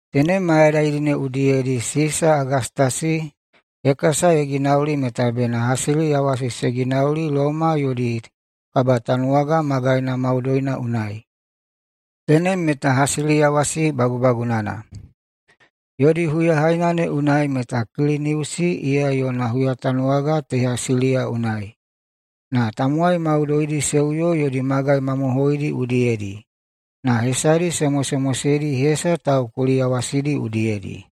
Tenem mayadaidi ne udiyedi Sisa Agastasi hekasa ye ginauli meta bena hasiliyawasi se ginauli Loma yodi kabatanuwaga magaina maudoina unai. Tenem meta hasiliyawasi bagubagunana. Yodi huyahaina ne unai meta Kiliniusi iya yona huyatanuwaga teha Siliya unai. Na tamowai maudoidi se uyo yodi magai mamohoidi udiyedi na hesadi se mosemoseidi hesa taukuliyawasidi udiyedi.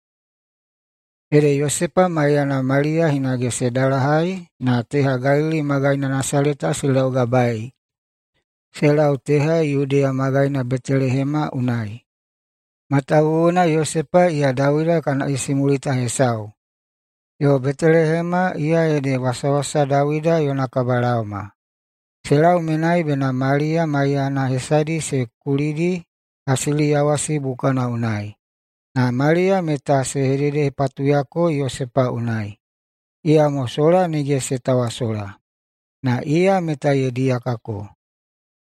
Ede Yosepa maiyana Maliya hinage se dalahai na teha Galili magaina Nasaleta se laugabae se lau teha Yudeya magaina Betelehema unai. Matawuwuna Yosepa iya Dawida kana isimulita hesau, yo Betelehema iya ede wasawasa Dawida yona kabalaoma. Se lau menai bena Maliya maiyana hesadi se kulidi hasiliyawasi bukana unai. Na Maliya meta se hededehepatuyako Yosepa unai, iyamo sola nige se tawasola, na iya meta ye diyakako.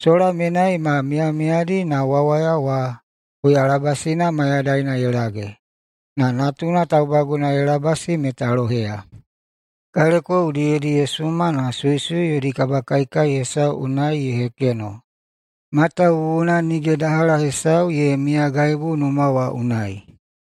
Sola menai ma miyamiyadi na wawaya wa huyalabasina mayadaina ye lage, na natuna taubaguna ye labasi meta loheya. Kaleko udiyedi ye suma na suisui yodi kabakaikai hesau unai ye hekeno, matawuwuna nige dahala hesau ye miyagaibu numa wa unai.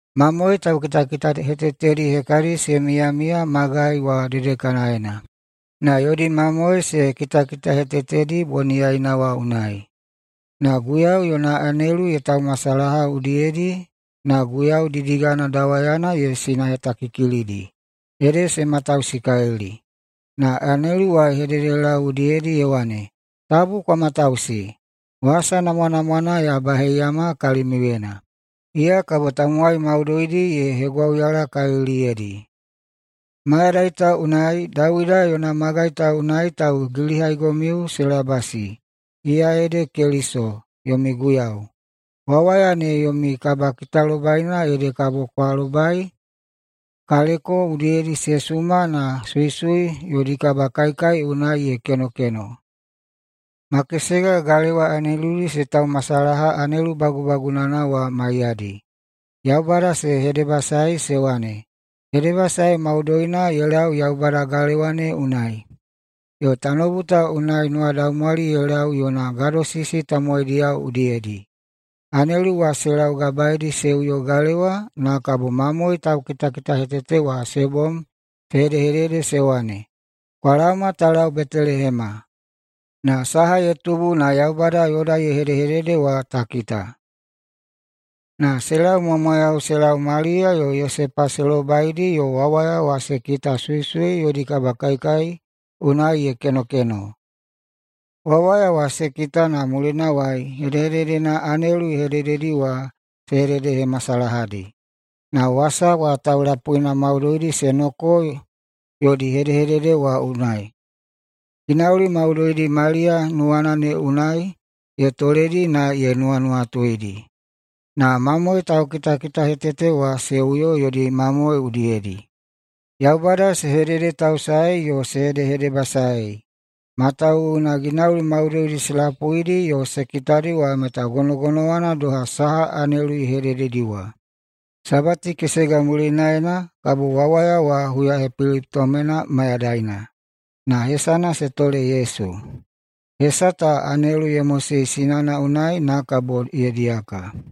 Mamoe taukitakitahetetedi hekadi se miyamiya magai wa dedekanaena, na yodi mamoe se kitakitahetetedi boniyaina wa unai. Na Guiyau yona anelu ye taumasalaha udiyedi na Guiyau didigana dawayana ye sinahetakikilidi, ede se matausikalili. Na anelu wa ye hededelau udiyedi ye wane, “Tabu kwa matausi. Wasa namwanamwana ya baheiyama kalimiuyena, iya kabo tamowai maudoidi ye hegwauyalakaliliyedi. Mayadai ta unai Dawida yona magai ta unai taugilihaigomiu se labasi, iya ede Keliso, yomi Guiyau. Wawaya ne yomi kabakitalobaina ede kabo kwa lobai kaleko udiyedi se suma na suisui yodi kabakaikai unai ye kenokeno.” Na makesega galewa aneludi se taumasalaha anelu bagubagunana wa maiyadi. Yaubada se hedebasaei se wane, “Hedebasae maudoina ye lau Yaubada galewa ne unai, yo tanoubu ta unai nuwadaumwali ye lau yona gadosisi tamowaidiyao udiyedi.” Anelu wa se laugabaeidi se uyo galewa, na kabo mamoe taukitakitahetete wa se bom se hedehedede se wane, “Kwa laoma ta lau Betelehema, na saha ye tubu na Yaubada yoda ye hedehedede wa ta kita.” Na se laumwamwayau se lau, Maliya yo Yosepa se lobaidi yo wawaya wa se kita suisui yodi kabakaikai unai ye kenokeno. Wawaya wa se kita na mulinawai hedehededena anelu ye hedededi wa se hededehemasalahadi, na wasa wa taulapuina maudoidi se noko yodi hedehedede wa unai. Ginauli maudoidi wa Maliya nuwana ne unai ye toledi na ye nuwanuwatuidi. Na mamoe taukitakitahetete wa se uyo yodi mamoe udiyedi. Yaubada se hededetausae yo se hedehedebasae, matawuwuna ginauli maudoidi se lapuidi yo se kitadi wa meta gonogonowana doha saha anelu ye hedededi wa. Sabati kesega mulinaena kabo wawaya wa huyahepelitomena mayadaina, na hesana se tole Yesu. Hesa ta anelu ye mosei sinana unai na kabo ye diyaka.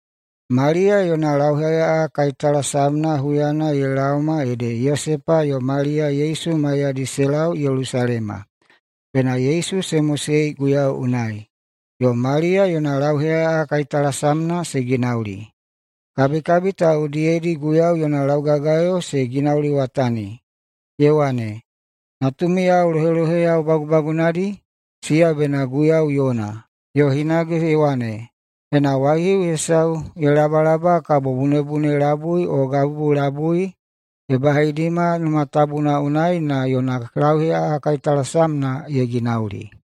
Maliya yona lauheꞌaꞌa kaitalasamna huyana ye laoma ede Yosepa yo Maliya Yesu maiyadi se lau Yelusalema, bena Yesu se mosei Guiyau unai, yo Maliya yona lauheꞌaꞌa kaitalasamna se ginauli. Kabikabi ta udiyedi Guiyau yona laugagayo se ginauliwatani, ye wane, “Natumiyao loheloheyao bagubagunadi, siya bena Guiyau yona.” Yo hinage ye wane, “Ena waihiu hesau ye labalaba kabo bunebune labui o gabubu labui” ye baheidima Numa Tabuna unai na yona lauheꞌaꞌa kaitalasamna ye ginauli.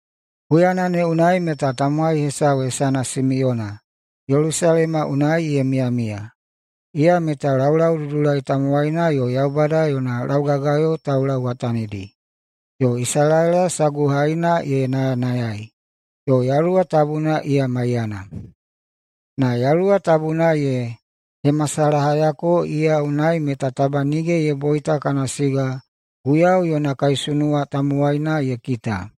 Huyana ne unai meta tamowai hesau hesana Simiyona Yelusalema unai ye miyamiya. Iya meta laulaududulai tamowaina yo Yaubada yona laugagayo taulauwatanidi, yo Isalaela saguhaina ye nayanayai, yo Yaluwa Tabuna iya maiyana. Na Yaluwa Tabuna ye hemasalahayako iya unai meta taba nige ye boita kana siga Guiyau yona kaisunuwa tamowaina ye kita.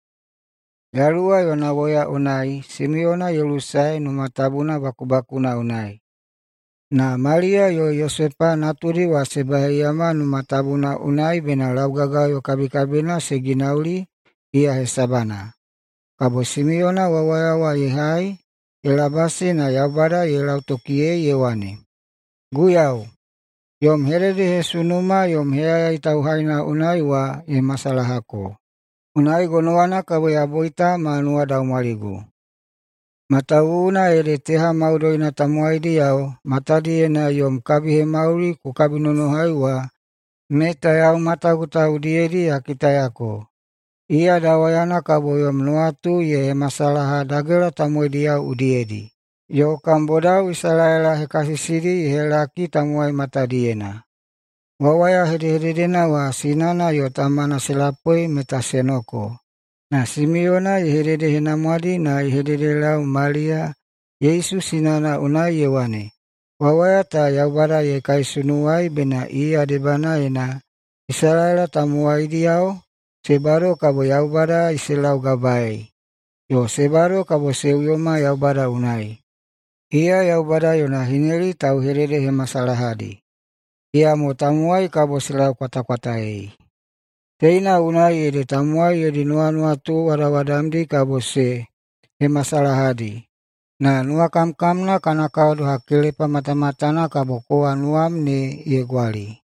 Yaluwa yona woya unai Simiyona ye lusae Numa Tabuna bakubakuna unai. Na Maliya yo Yosepa natudi wa se baheiyama Numa Tabuna unai bena laugagayo kabikabina se ginauli iya hesabana. Kabo Simiyona wawaya wa ye hai ye labasi na Yaubada ye lautokiyei ye wane, “Guiyau, yom hededehesunuma yom heyayai tauhaina unai wa ye masalahako. Unai gonowana kabo ya boita ma nuwadaumwaligu. Matawuwuna ede teha maudoina tamowaidiyao matadiyena yom kabihemauli ku kabinonohai wa meta yau matagu ta udiyedi ya kitayako: Iya dawayana kabo yom nuwatu ye hemasalaha dagela tamowaidiyao udiyedi, yo kam bodao Isalaela hekasisidi ye helaki tamowai matadiyena.” Wawaya hedehededena wa sinana yo tamana se lapui meta se noko. Na Simiyona ye hededehenamwadi na ye hededelau Maliya Yesu sinana unai ye wane, “Wawaya ta Yaubada ye kaisunuwai bena iya debanaena Isalaela tamowaidiyao se bado kabo Yaubada se laugabaei, yo se bado kabo se uyoma Yaubada unai. Iya Yaubada yona hineli tauhededehemasalahadi, iyamo tamowai kabo se laukwatakwataei. Teina unai ede tamowai yodi nuwanuwatu wadawadamdi kabo ye hemasalahadi. Na nuwakamkamna kana kao doha kelepa matamatana kabo kowa nuwam ne ye gwali.”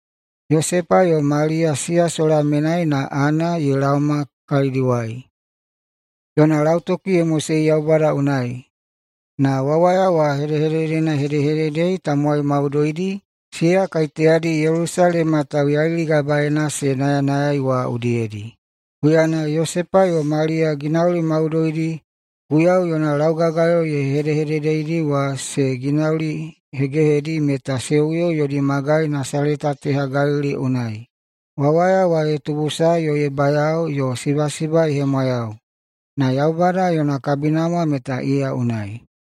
Yosepa yo Maliya siya sola menai na Ana ye laoma kalidiwai. Yona lautoki ye mosei Yaubada unai, na wawaya wa hedehededena ye hedehededei tamowai maudoidi, siya kaiteyadi Yelusalema tauyailigabaeina se nayanayaei wa udiyedi. Huyana Yosepa yo Maliya ginauli maudoidi Guiyau yona laugagayo ye hedehededeidi wa se ginaulihegehedi meta se uyo yodi magai Nasaleta teha Galili unai. Wawaya wa ye tubusae yo ye bayao, yo sibasiba ye hemwayau. Na Yaubada yona kabinamwa meta iya unai.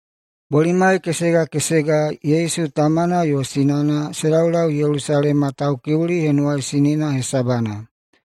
Bolimai kesega kesega Yesu tamana yo sinana se laulau Yelusalema Taukiuli Henuwaisinina hesabana.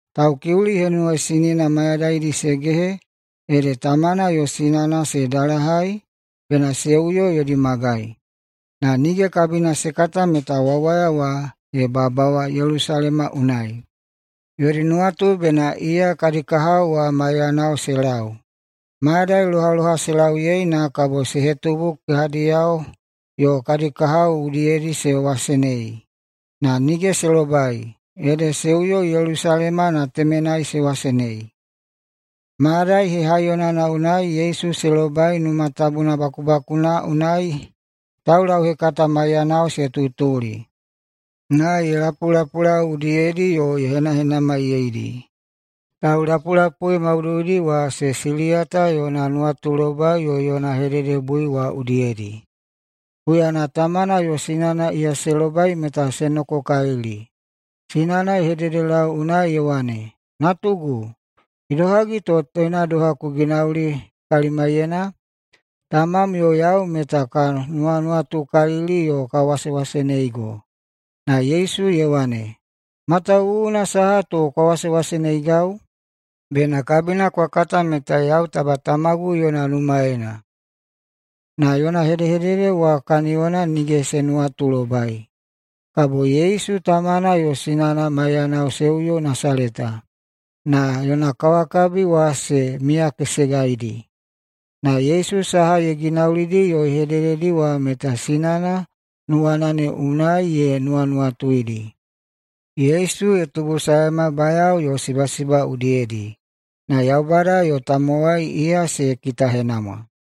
Taukiuli Henuwaisinina mayadaidi se gehe ede tamana yo sinana se dalahai bena se uyo yodi magai, na nige kabina se kata meta wawaya wa ye babawa Yelusalema unai. Yodi nuwatu bena iya kadi kahao wa maiyanao se lau. Mayadai lohaloha se lauyei, na kabo se hetubu kehadiyao yo kadi kahao udiyedi se wasenei. Na nige se lobai, ede se uyo Yelusalema na temenai se wasenei. Mayadai hehaiyonana unai Yesu se lobai Numa Tabuna bakubakuna unai taulauhekata maiyanao se tutuli, na ye lapulapulau udiyedi yo ye henahenamaiyeidi. Taulapulapui maudoidi wa se siliyata yona nuwatulobai yo yona hededebui wa udiyedi. Huyana tamana yo sinana iya se lobai meta se nokokalili. Sinana ye hededelau unai ye wane, “Natugu, idohagi to teina doha ku ginauli kalimaiyena? Tamam yo yau meta ka nuwanuwatukalili yo ka wasewaseneigo.” Na Yesu ye wane, “Matawuwuna saha to kwa wasewaseneigau? Bena kabina kwa kata meta yau taba Tamagu yona numaena.” Na yona hedehedede wa kaniyona nige se nuwatulobai. Na kabo Yesu tamana yo sinana maiyanao se uyo Nasaleta, na yona kawakabi wa se miyakesegaidi. Na Yesu saha ye ginaulidi yo ye hedededi wa meta sinana nuwana ne unai ye nuwanuwatuidi. Yesu ye tubusaema bayao yo sibasiba udiyedi na Yaubada yo tamowai iya se kitahenamwa.